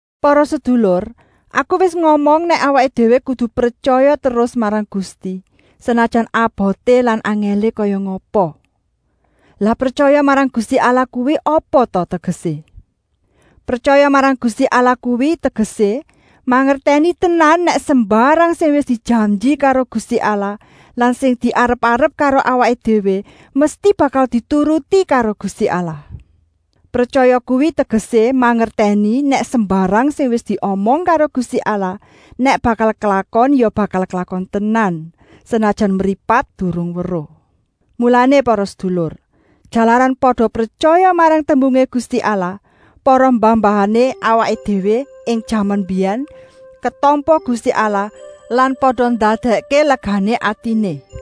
Para sedulur, aku wis ngomong nèk awaké déwé kudu pretyaya terus marang Gusti, senajan aboté lan angèlé kaya ngapa. Lah pretyaya marang Gusti Allah kuwi apa ta tegesé? Pretyaya marang Gusti Allah kuwi tegesé mangertèni tenan nèk sembarang sing wis dijanji karo Gusti Allah lan sing diarep-arep karo awaké déwé mesti bakal dituruti karo Gusti Allah. Pretyaya kuwi tegesé mangertèni nèk sembarang sing wis diomong karo Gusti Allah nèk bakal klakon ya bakal klakon tenan, senajan mripat durung weruh. Mulané para sedulur, jalaran pada pretyaya marang tembungé Gusti Allah, para mbah-mbahané awaké déwé ing jaman mbiyèn ketampa Gusti Allah lan pada ndadèkké legané atiné.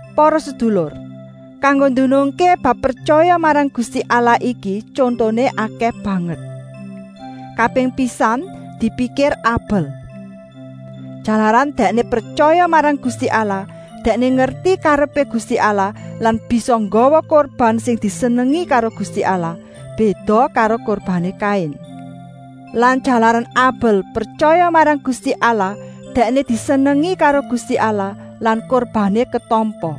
Para sedulur, kanggo ndunungké bab pretyaya marang Gusti Allah iki tyontoné okèh banget. Kaping pisan, dipikir Abel. Jalaran dèkné pretyaya marang Gusti Allah, dèkné ngerti karepé Gusti Allah lan bisa nggawa kurban sing disenengi karo Gusti Allah, béda karo kurbané Kain. Lan jalaran Abel pretyaya marang Gusti Allah dèkné disenengi karo Gusti Allah lan kurbané ketampa.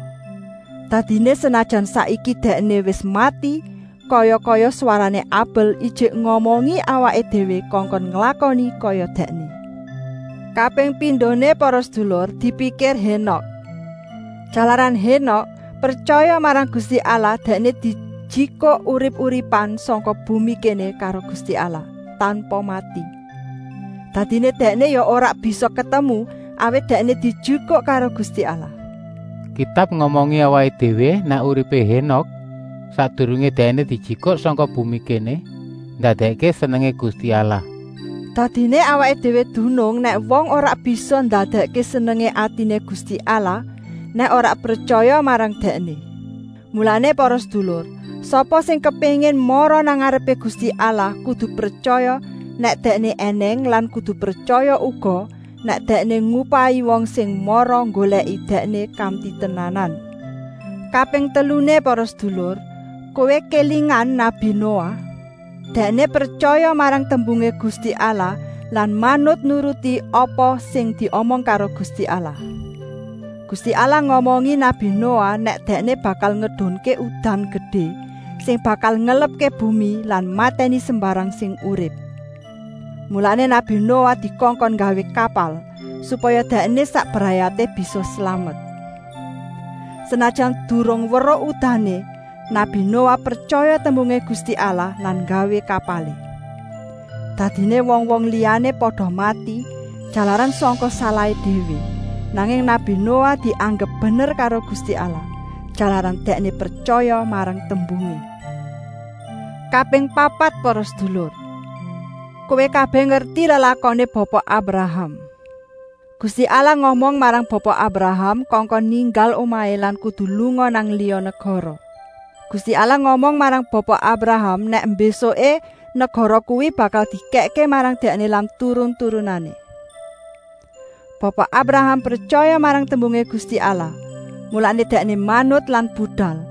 Dadiné senajan saiki dèkné wis mati kaya-kaya swarané Abel ijik ngomongi awaké déwé kongkon nglakoni kaya dèkné. Kaping pindoné para sedulur, dipikir Hénok. Jalaran Hénok pretyaya marang Gusti Allah dèkné dijikuk urip-uripan sangka bumi kéné karo Gusti Allah, tanpa mati. Dadiné dèkné ya ora bisa ketemu, awit dèkné dijikuk karo Gusti Allah. Kitab ngomongi awaké déwé nèk uripé Hénok, sakdurungé dèkné dijikuk sangka bumi kéné, ndadèkké senengé Gusti Allah. Dadiné awaké déwé dunung nèk wong ora bisa ndadèkké senengé atiné Gusti Allah, nèk ora pretyaya marang Dèkné. Mulané para sedulur, sapa sing kepéngin mara nang ngarepé Gusti Allah kudu pretyaya nèk Dèkné ènèng lan kudu pretyaya uga nèk Dèkné ngupahi wong sing mara nggolèki Dèkné kanti tenanan. Kaping teluné para sedulur, kowé kélingan nabi Noah. Dèkné pretyaya marang tembungé Gusti Allah lan manut nuruti apa sing diomong karo Gusti Allah. Gusti Allah ngomongi nabi Noah nèk Dèkné bakal ngedunké udan gedé sing bakal ngelepké bumi lan matèni sembarang sing urip. Mulané nabi Noah dikongkon nggawé kapal, supaya dèkné sak brayaté bisa slamet. Senajan durung weruh udané, nabi Noah pretyaya tembungé Gusti Allah lan nggawé kapalé. Dadiné wong-wong liyané pada mati, jalaran sangka salahé déwé, nanging nabi Noah dianggep bener karo Gusti Allah, jalaran dèkné pretyaya marang tembungé. Kaping papat para sedulur. Kowé kabèh ngerti lelakoné Bapa Abraham. Gusti Allah ngomong marang Bapa Abraham kongkon ninggal omahé lan kudu lunga nang liya negara. Gusti Allah ngomong marang Bapa Abraham nèk mbésuké negara kuwi bakal dikèkké marang dèkné lan turun-turunané. Bapa Abraham pretyaya marang tembungé Gusti Allah, mulané dèkné manut lan budal,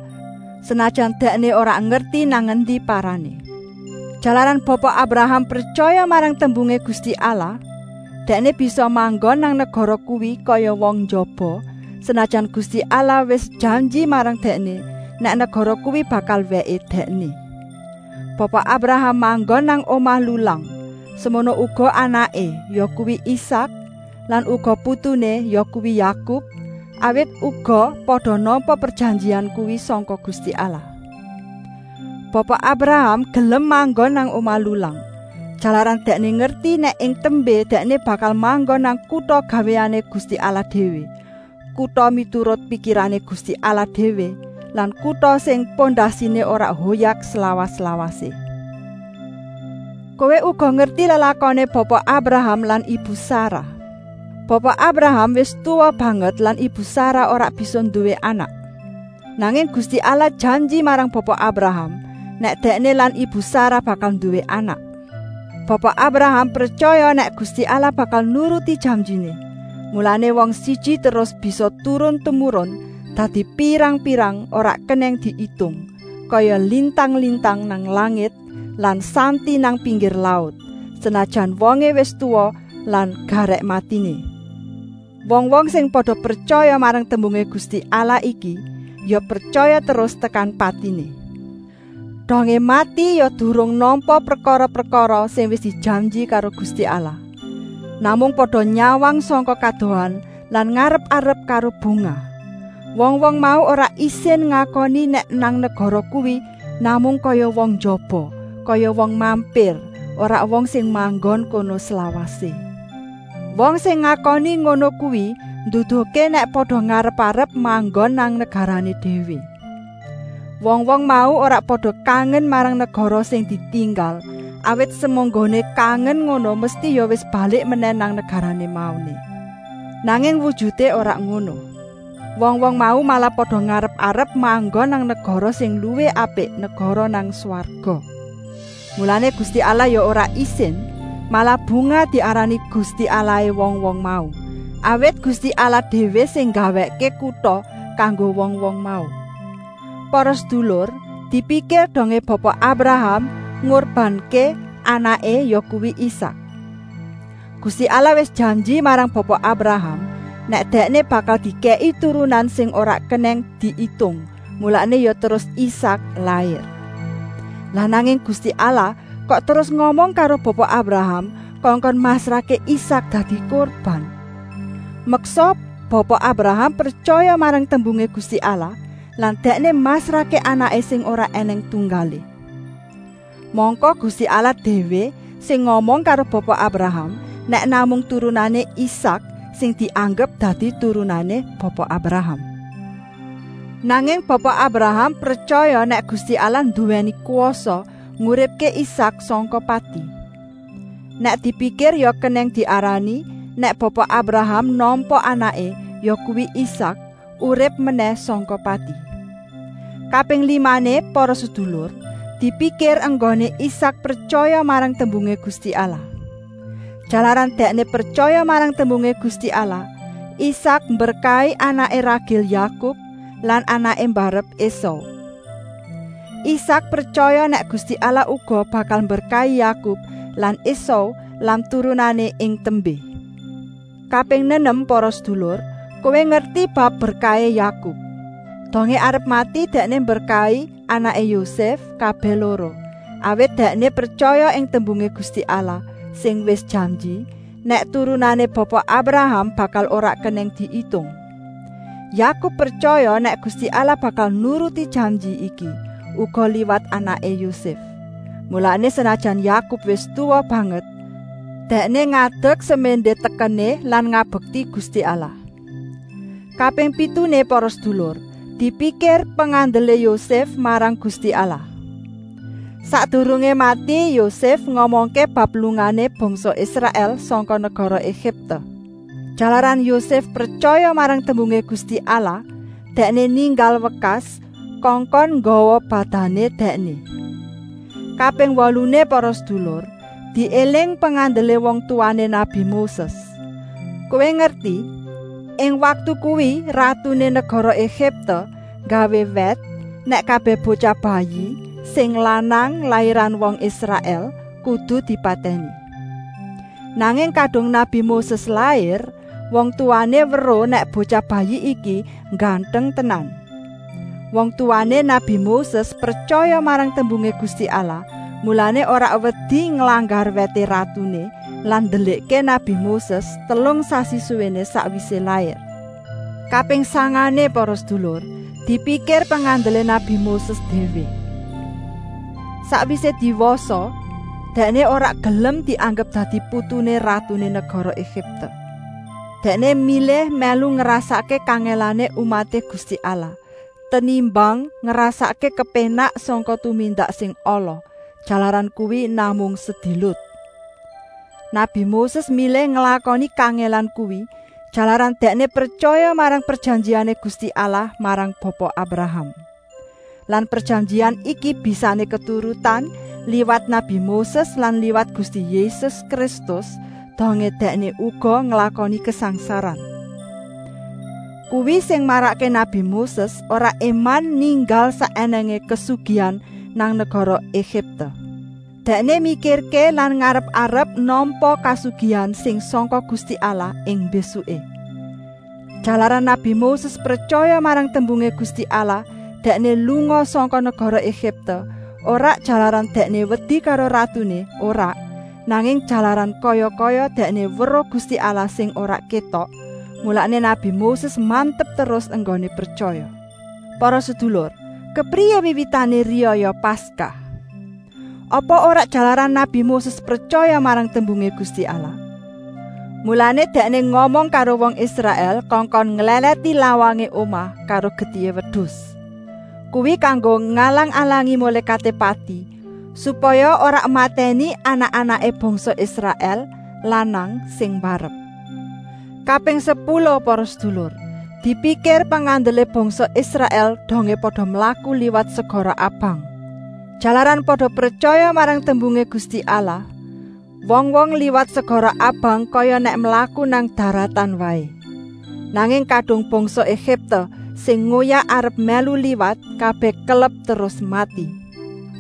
senajan dèkné ora ngerti nang endi parané. Jalaran Bapa Abraham pretyaya marang tembungé Gusti Allah, dèkné bisa manggon nang negara kuwi kaya wong njaba, senajan Gusti Allah wis janji marang dèkné, nèk negara kuwi bakal wèké dèkné. Bapa Abraham manggon nang omah lulang, semono uga anaké, yakuwi Isak lan uga putuné, yakuwi Yakub, awit uga pada nampa prejanjian kuwi sangka Gusti Allah. Bapa Abraham gelem manggon nang omah lulang, jalaran dèkné ngerti nèk ing tembé dèkné bakal manggon nang kuta gawéané Gusti Allah déwé, kuta miturut pikirané Gusti Allah déwé lan kuta sing pondasiné ora hoyak slawas-lawasé. Kowé uga ngerti lelakoné Bapa Abraham lan ibu Sarah. Bapa Abraham wis tuwa banget lan ibu Sarah ora bisa nduwé anak. Nanging Gusti Allah janji marang Bapa Abraham nèk dèkné lan ibu Sarah bakal nduwé anak. Bapa Abraham pretyaya nèk Gusti Allah bakal nuruti janjiné, mulané wong siji terus bisa turun-tumurun dadi pirang-pirang, ora kenèng diitung, kaya lintang-lintang nang langit lan santi nang pinggir laut, senajan wongé wis tuwa lan garèk matiné. Wong-wong sing pada pretyaya marang tembungé Gusti Allah iki ya pretyaya terus tekan patiné. Dongé mati ya durung nampa prekara-prekara sing wis dijanji karo Gusti Allah. Namung pada nyawang sangka kadohan lan ngarep-arep karo bungah. Wong-wong mau ora isin ngakoni nèk nang negara kuwi namung kaya wong njaba, kaya wong mampir, ora wong sing manggon kono slawasé. Wong sing ngakoni ngono kuwi nduduhké nèk pada ngarep-arep manggon nang negarané déwé. Wong-wong mau ora pada kangen marang negara sing ditinggal, awit semunggoné kangen ngono mesti ya wis balik menèh nang negarané mauné. Nanging wujuté ora ngono. Wong-wong mau malah pada ngarep-arep manggon nang negara sing luwih apik, negara nang swarga. Mulané Gusti Allah ya ora isin, malah bungah diarani Gusti Allahé wong-wong mau, awit Gusti Allah déwé sing nggawèkké kuta kanggo wong-wong mau. Para sedulur, dipikir dongé Bapa Abraham ngurbanké anaké, yakuwi Isak. Gusti Allah wis janji marang Bapa Abraham nèk dèkné bakal dikèki turunan sing ora kenèng diitung, mulané ya terus Isak lair. Lah nanging Gusti Allah kok terus ngomong karo Bapa Abraham kongkon masrahké Isak dadi kurban? Meksa Bapa Abraham pretyaya marang tembungé Gusti Allah lan dèkné masrahké anaké sing ora ènèng tunggalé. Mangka Gusti Allah déwé sing ngomong karo Bapa Abraham, nèk namung turunané Isak sing dianggep dadi turunané Bapa Abraham. Nanging Bapa Abraham pretyaya nèk Gusti Allah nduwèni kwasa nguripké Isak sangka pati. Nèk dipikir ya kenèng diarani, nèk Bapa Abraham nampa anaké, yakuwi Isak, urip menèh sangka pati. Kaping limané para sedulur, dipikir enggoné Isak pretyaya marang tembungé Gusti Allah. Jalaran dèkné pretyaya marang tembungé Gusti Allah, Isak mberkahi anaké ragil Yakub lan anaké mbarep Esau. Isak pretyaya nèk Gusti Allah uga bakal mberkahi Yakub lan Esau lan turunané ing tembé. Kaping nenem para sedulur, kowé ngerti bab berkahé Yakub. Dongé arep mati dèkné mberkahi anaké Yosèf kabèh loro, awit dèkné pretyaya ing tembungé Gusti Allah, sing wis janji, nèk turunané Bapa Abraham bakal ora kenèng diitung. Yakub pretyaya nèk Gusti Allah bakal nuruti janji iki uga liwat anaké Yosèf, mulané senajan Yakub wis tuwa banget, dèkné ngadek seméndé tekené lan ngabekti Gusti Allah. Kaping pituné para sedulur, dipikir pengandelé Yosèf marang Gusti Allah. Sakdurungé mati Yosèf ngomongké bab lungané bangsa Israèl sangka negara Egipte. Jalaran Yosèf pretyaya marang tembungé Gusti Allah, dèkné ninggal wekas, kongkon nggawa badané dèkné. Kaping woluné para sedulur, diéling pengandelé wong tuwané nabi Moses. Kowé ngerti, ing waktu kuwi ratuné negara Egipte nggawé wèt nèk kabèh botyah bayi sing lanang lairan wong Israèl kudu dipatèni. Nanging kadung nabi Moses lair, wong tuwané weruh nèk botyah bayi iki ngganteng tenan. Wong tuwané nabi Moses pretyaya marang tembungé Gusti Allah, mulané ora wedi nglanggar wèté ratuné lan ndelikké nabi Moses telung sasi suwéné sakwisé lair. Kaping sangané para sedulur, dipikir pengandelé nabi Moses déwé. Sakwisé diwasa dèkné ora gelem dianggep dadi putuné ratuné negara Egipte. Dèkné milih mèlu ngrasakké kangèlané umaté Gusti Allah, tenimbang ngrasakké kepénak sangka tumindak sing ala, jalaran kuwi namung sedilut. Nabi Moses milih nglakoni kangèlan kuwi, jalaran dèkné pretyaya marang prejanjiané Gusti Allah marang Bapa Abraham. Lan prejanjian iki bisané keturutan liwat nabi Moses lan liwat Gusti Yésus Kristus dongé Dèkné uga nglakoni kasangsaran. Kuwi sing marakké nabi Moses ora éman ninggal sak ènèngé kasugihan nang negara Egipte. Dèkné mikirké lan ngarep-arep nampa kasugihan sing sangka Gusti Allah ing mbésuké. Jalaran nabi Moses pretyaya marang tembungé Gusti Allah dèkné lunga sangka negara Egipte, ora jalaran dèkné wedi karo ratuné, ora, nanging jalaran kaya-kaya dèkné weruh Gusti Allah sing ora kétok, mulané nabi Moses mantep terus enggoné pretyaya. Para sedulur, kepriyé wiwitané riyaya Paskah? Apa ora jalaran nabi Moses pretyaya marang tembungé Gusti Allah? Mulané dèkné ngomong karo wong Israèl kongkon nglèlèti lawangé omah karo getihé wedus. Kuwi kanggo ngalang-alangi Mulékaté Pati, supaya ora matèni anak-anaké bangsa Israèl lanang sing mbarep. Kaping sepuluh para sedulur, dipikir pengandelé bangsa Israèl dongé pada mlaku liwat segara Abang. Jalaran pada pretyaya marang tembungé Gusti Allah, wong-wong liwat segara Abang kaya nèk mlaku nang daratan waé. Nanging kadung bangsa Egipte sing ngoyak arep mèlu liwat, kabèh kelep terus mati.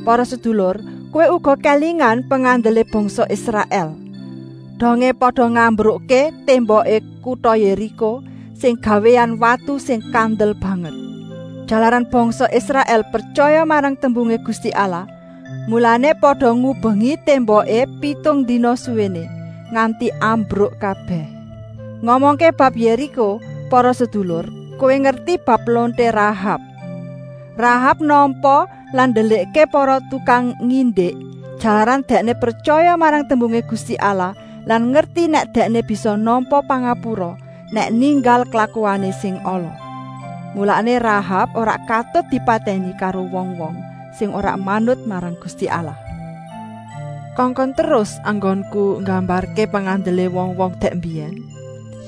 Para sedulur, kowé uga kélingan pengandelé bangsa Israèl, dongé pada ngambrukké témboké kuta Yériko sing gawéan watu sing kandel banget. Jalaran bangsa Israèl pretyaya marang tembungé Gusti Allah, mulané pada ngubengi témboké pitung dina suwéné, nganti ambruk kabèh. Ngomongké bab Yériko para sedulur, kowé ngerti bab lonté Rahab. Rahab nampa lan ndelikké para tukang ngindik, jalaran dèkné pretyaya marang tembungé Gusti Allah lan ngerti nèk dèkné bisa nampa pangapura, nèk ninggal klakuané sing ala. Mulané Rahab ora katut dipatèni karo wong-wong sing ora manut marang Gusti Allah. Kongkon terus enggonku nggambarké pengandelé wong-wong dèk mbiyèn?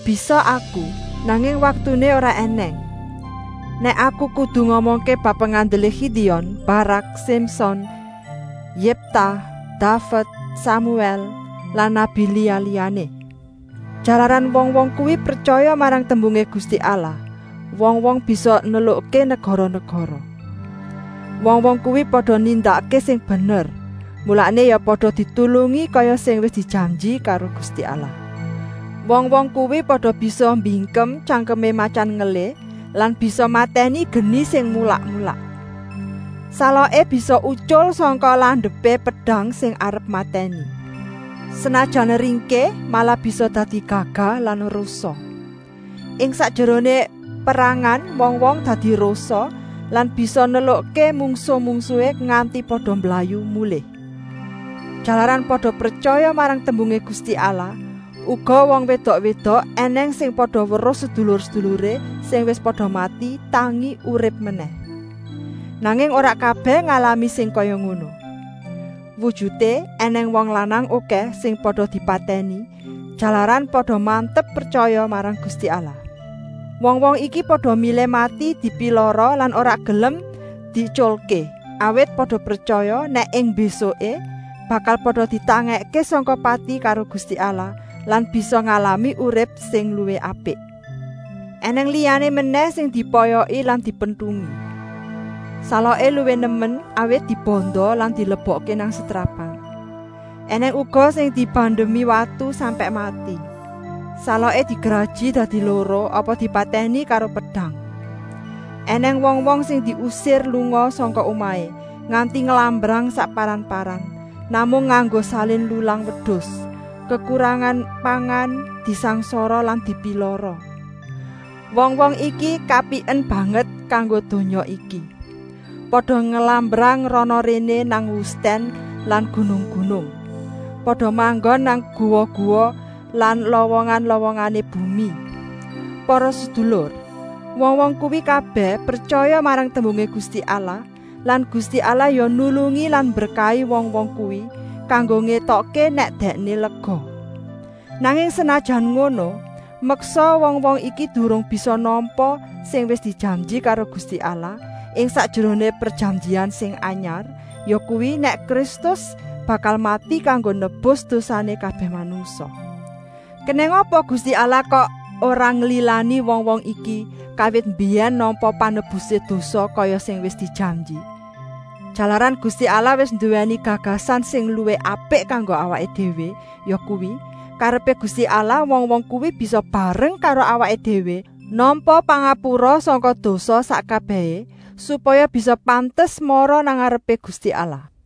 Bisa aku, nanging waktuné ora ènèng, nèk aku kudu ngomongké bab pengandelé Gidion, Barak, Simson, Yèpta, Daved, Samuèl lan nabi liya-liyané. Jalaran wong-wong kuwi pretyaya marang tembungé Gusti Allah, wong-wong bisa nelukké negara-negara. Wong-wong kuwi pada nindakké sing bener, mulané ya pada ditulungi kaya sing wis dijanji karo Gusti Allah. Wong-wong kuwi pada bisa mbingkem tyangkemé matyan ngelih lan bisa matèni geni sing mulak-mulak. Saloké bisa utyul sangka landepé pedang sing arep matèni. Senajan ringkih malah bisa dadi gagah lan rosa. Ing sakjeroné perangan wong-wong dadi rosa lan bisa nelukké mungsuh-mungsuhé nganti pada mblayu mulih. Jalaran pada pretyaya marang tembungé Gusti Allah, uga wong wédok-wédok ènèng sing pada weruh sedulur-seduluré sing wis pada mati tangi urip menèh. Nanging ora kabèh ngalami sing kaya ngono. Wujuté ènèng wong lanang okèh sing pada dipatèni, jalaran pada mantep pretyaya marang Gusti Allah. Wong-wong iki pada milih mati dipilara lan ora gelem dietyulké, awit pada pretyaya nèk ing mbésuké bakal pada ditangèkké sangka pati karo Gusti Allah lan bisa ngalami urip sing luwih apik. Enèng liyané menèh sing dipoyoki lan dipentungi. Saloké luwih nemen, awit dibanda lan dilebokké nang setrapan. Enèng uga sing dibandemi watu sampèk mati, saloké digraji dadi loro apa dipatèni karo pedang. Enèng wong-wong sing diusir lunga sangka omahé, nganti nglambrang sakparan-paran, namung nganggo salin lulang wedus, kekurangan pangan, disangsara lan dipilara. Wong-wong iki kapiken banget kanggo donya iki. Pada nglambrang rana-réné nang wustèn lan gunung-gunung. Pada manggon nang guwa-guwa lan lowongan-lowongané bumi. Para sedulur, wong-wong kuwi kabèh pretyaya marang tembungé Gusti Allah lan Gusti Allah ya nulungi lan mberkahi wong-wong kuwi kanggo ngétokké nèk Dèkné lega. Nanging senajan ngono, meksa wong-wong iki durung bisa nampa sing wis dijanji karo Gusti Allah ing sakjeroné prejanjian sing anyar, yakuwi, nèk Kristus bakal mati kanggo nebus dosané kabèh manungsa. Kenèng apa Gusti Allah kok ora nglilani wong-wong iki kawit mbiyèn nampa panebusé dosa kaya sing wis dijanji? Jalaran Gusti Allah wis nduwèni gagasan sing luwih apik kanggo awaké déwé, yakuwi, karepé Gusti Allah wong-wong kuwi bisa bareng karo awaké déwé nampa pangapura sangka dosa sak kabèhé, supaya bisa pantes mara nang ngarepé Gusti Allah.